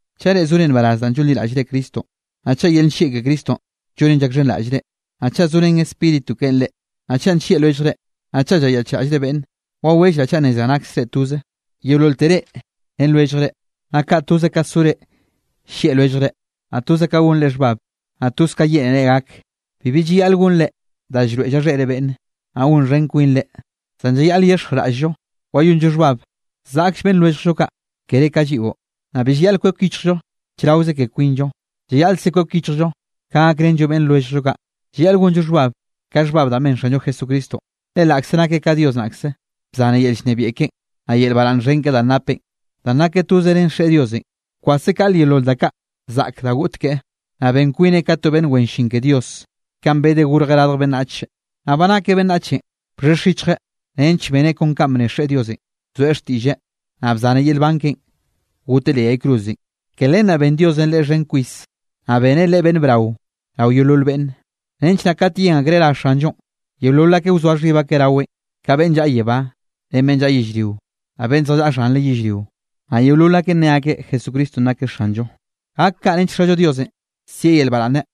Chaꞌ reꞌ zore nbaraz danꞌ llonliraꞌllre Cristonꞌ, naꞌ chaꞌ yel nllieꞌ ke Cristonꞌ llonen llakxhenraꞌllre, naꞌ chaꞌ zorén Spíritu keꞌen reꞌ, naꞌ chaꞌ nllieꞌ lwelljre, naꞌ chaꞌ llayaꞌchraꞌllre beꞌnne, wawellraꞌ chaꞌ nnezraꞌ naksre toze, yeololte reꞌ ren lwelljre, naꞌ kaꞌ toze ka zore llieꞌ lwelljre, naꞌ toze ka gonre xhbab, naꞌ toz ka yeꞌnere gak. Bibi llayaꞌl gonre da llroeꞌ llaxheꞌre beꞌnne, naꞌ gonxhen kwinre, zan llayaꞌl yexjraꞌll-llo wayonllo xhbab zaꞌkll beꞌnn lwelljllo kaꞌ kere ka lliꞌo. Naꞌ bi llayaꞌl kwek yichjllo chraoze ke kwinllo, llayaꞌlkze kwek yichjllo ka gakrenllo beꞌnn lwelljllo kaꞌ. Llayaꞌl gonllo xhbab, ka xhbab da ben Xanllo Jesucristonꞌ. Le laꞌkze nakeꞌ ka Dios naꞌkze, bzanreꞌ yel llnebiaꞌ keꞌen, naꞌ yel baraꞌnn xhen keꞌe danꞌ napeꞌ, danꞌ nakeꞌ toze ren Xeꞌe Diosenꞌ. Bkwaseꞌ kaꞌle yeolol da kaꞌ zaꞌk da goꞌt keꞌe, naꞌ ben kwineꞌ ka to beꞌnn wen llin ke Dios, kanꞌ bedeꞌ gorjeꞌ radj beꞌnnach. Naꞌ ba nakeꞌ beꞌnnachenꞌ bxhexj yichjeꞌ nench beneꞌ kon kanꞌ bne Xeꞌe Diosenꞌ. Bzoeꞌ xtiꞌlleꞌ, naꞌ bzaneꞌ yel nban keꞌen goteꞌ leꞌ yay cruzenꞌ. Ke len naꞌ ben Diosenꞌ Leꞌe xhen kwis, naꞌ beneꞌ Leꞌe beꞌnn brao rao yeolol beꞌnne, nench naꞌ kat yen akreꞌ ra Xanllonꞌ, yeolol akeꞌ wzoa xhib akeꞌ raweꞌn, ka beꞌnn llaꞌa yebá, ren beꞌnn llaꞌa yellrio, naꞌ beꞌnn zjallaꞌa xhanre yellrio. Naꞌ yeolol akeꞌ nne akeꞌ Jesucristonꞌ nakeꞌ Xanllo, gak kaꞌ nench Xallo Diosenꞌ sieꞌ yel baraꞌnne.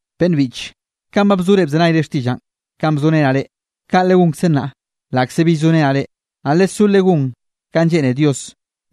Beꞌnn biꞌche, kanꞌ ba bzore bzenayre xtiꞌllaꞌ kanꞌ bzorenaꞌ reꞌ, kaꞌ legonkze nnaꞌ laꞌkze bill zorenaꞌ reꞌ. Naꞌ lesó legón kanꞌ lleꞌne Dios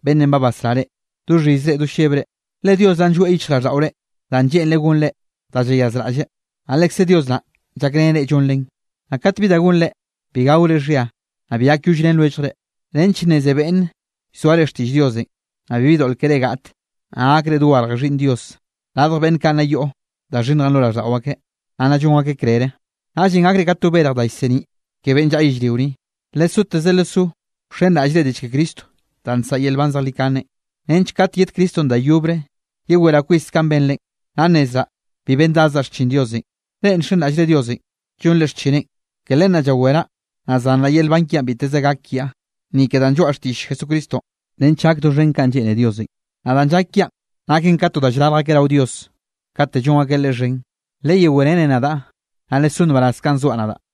beꞌnn ba basrá reꞌ, do xhizre do llebre. Le Dios naꞌn llgoeꞌ yichjraꞌlldaꞌore danꞌ lleꞌnreꞌ gonre da llayazraꞌlleꞌ, naꞌ lekzeꞌ Dios naꞌ llakreneꞌ reꞌ llonrenꞌ. Naꞌ kat bi da gonre, bi gaore xhia, naꞌ bi gakyollrén lwelljre, nench nneze beꞌnne llzoare xtiꞌll Diosenꞌ, naꞌ bibi doꞌl keré gaꞌte, naꞌ gakre dogarje xhiꞌnn Dios, radj beꞌnn kaꞌ nna yoꞌ da xhinnjenꞌ lo raꞌlldaꞌo akeꞌ, naꞌ nna llon akeꞌ krere. Naꞌllenꞌ gakre ka to berj da llseniꞌ ke beꞌnn llaꞌa yellrio ni. Lesoteze lesó wxenraꞌllre diꞌll ke Cristo da nsaꞌa yel nban zejlikane, nench kate yed Cristonꞌ da yobre, yeweraꞌ kwis kanꞌ benrenꞌ, naꞌ nnezraꞌ bi bendadzaꞌ xchin Diosenꞌ. Reꞌ nxenraꞌllre Diosenꞌ llonre xchineꞌn. Ke len naꞌ llaweraꞌ, naꞌ zanraꞌ yel nban kiaꞌn biteze gak kiaꞌ, ni ke danꞌ lloaꞌa xtiꞌll Jesucristonꞌ nench gak doxhen kanꞌ lleꞌne Diosenꞌ. Naꞌ danꞌ llak kiaꞌn naken ka to da llrarj akeꞌ rao Dios kate llon akeꞌ Leꞌe xhen. Leyewerene nadaꞌ, naꞌ lesó nbaraz kanꞌ zoaꞌ nadaꞌ.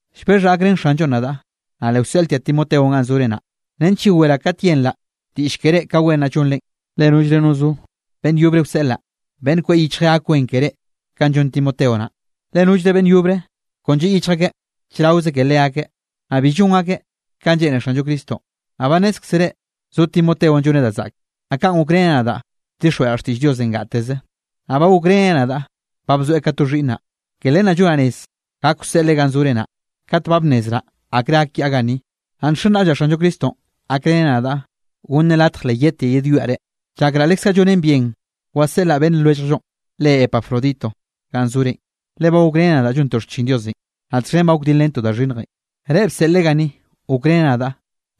Llbexhaꞌ gakrén Xanllonꞌ nadaꞌ, naꞌ le wseꞌltiaꞌ Timoteonꞌ ganꞌ zore naꞌ, nench yeweraꞌ kat yenraꞌ diꞌll ke reꞌ ka wen naꞌ llonre. Le nollre no zo beꞌnn yobre wseꞌlaꞌ, beꞌnn kweꞌ yichjeꞌ gak wen keré kanꞌ llon Timoteo naꞌ. Le nollre beꞌnn yobre kon lliꞌ yichj akeꞌ chraoze ke leakeꞌ, naꞌ bi llon akeꞌ kanꞌ lleꞌne Xanllo Cristonꞌ. Naꞌ ba nnézkzere zo Timoteonꞌ lloneꞌ da zaꞌke, naꞌ kanꞌ gokreneꞌ nadaꞌ bdixjweꞌraꞌ xtiꞌll Diosenꞌ gateze. Naꞌ ba gokreneꞌ nadaꞌ ba bzoeꞌ ka to xhiꞌnnaꞌ. Ke len naꞌ llonaꞌ rez gak wseꞌleꞌ ganꞌ zore naꞌ, kat ba bnnezraꞌ akre gak kiaꞌ ganni. Naꞌ nxenraꞌllaꞌ Xanllo Cristonꞌ gakreneꞌ nadaꞌ, gonneꞌ latj le yedtiaꞌ yedwiaꞌ reꞌ. Llakraꞌ lekze llonen bien waseꞌlaꞌ beꞌnn lwelljllonꞌ re Epafrodito ganꞌ zorenꞌ, le ba gokreneꞌ nadaꞌ llontoꞌ xchin Diosenꞌ, naꞌ txhen ba gokdilrentoꞌ da xhinnjenꞌ. Reꞌ bseꞌlreꞌ ganni gokreneꞌ nadaꞌ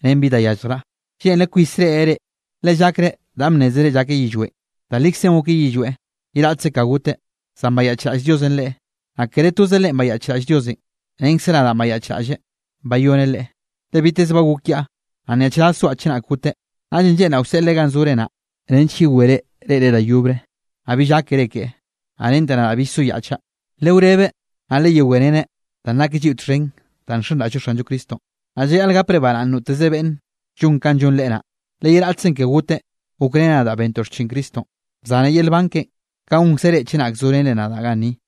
ren bi da yalljraꞌ. Lleꞌnreꞌ kwis reꞌreꞌ reꞌ, le llakreꞌ danꞌ bnnézere llakeꞌ yillweꞌn. Da likzenꞌ gokeꞌ yillweꞌ, ye raꞌtze ka goteꞌ, zan bayaꞌchraꞌll Diosenꞌ leꞌe, naꞌ kere toze leꞌen bayaꞌchraꞌll Diosenꞌ, renkze nadaꞌ bayaꞌchraꞌlleꞌ bayoneꞌ leꞌe, le biteze ba gok kiaꞌ, naꞌ nyaꞌchraz zoaꞌ chenak goteꞌ. Naꞌllenꞌ lleꞌnraꞌ wseꞌleꞌ ganꞌ zore naꞌ, nench yewere reꞌreꞌ da yobre, naꞌ bill gákere keꞌe. Naꞌ rente nadaꞌ bill soyaꞌchaꞌ. Lewrebeꞌ naꞌ leyewereneꞌ danꞌ nakeꞌ lliꞌo txhen danꞌ nxenraꞌll-llo Xanllo Cristonꞌ, naꞌ llayaꞌl gapreꞌ baraꞌnne noteze beꞌnn llon kanꞌ llon leꞌe naꞌ. Le ye raꞌtzenꞌ ke goteꞌ gokreneꞌ nadaꞌ bentoꞌ xchin Cristonꞌ, bzaneꞌ yel nban keꞌe, kaꞌ gonkze reꞌ chenak zorenre nadaꞌ ganni.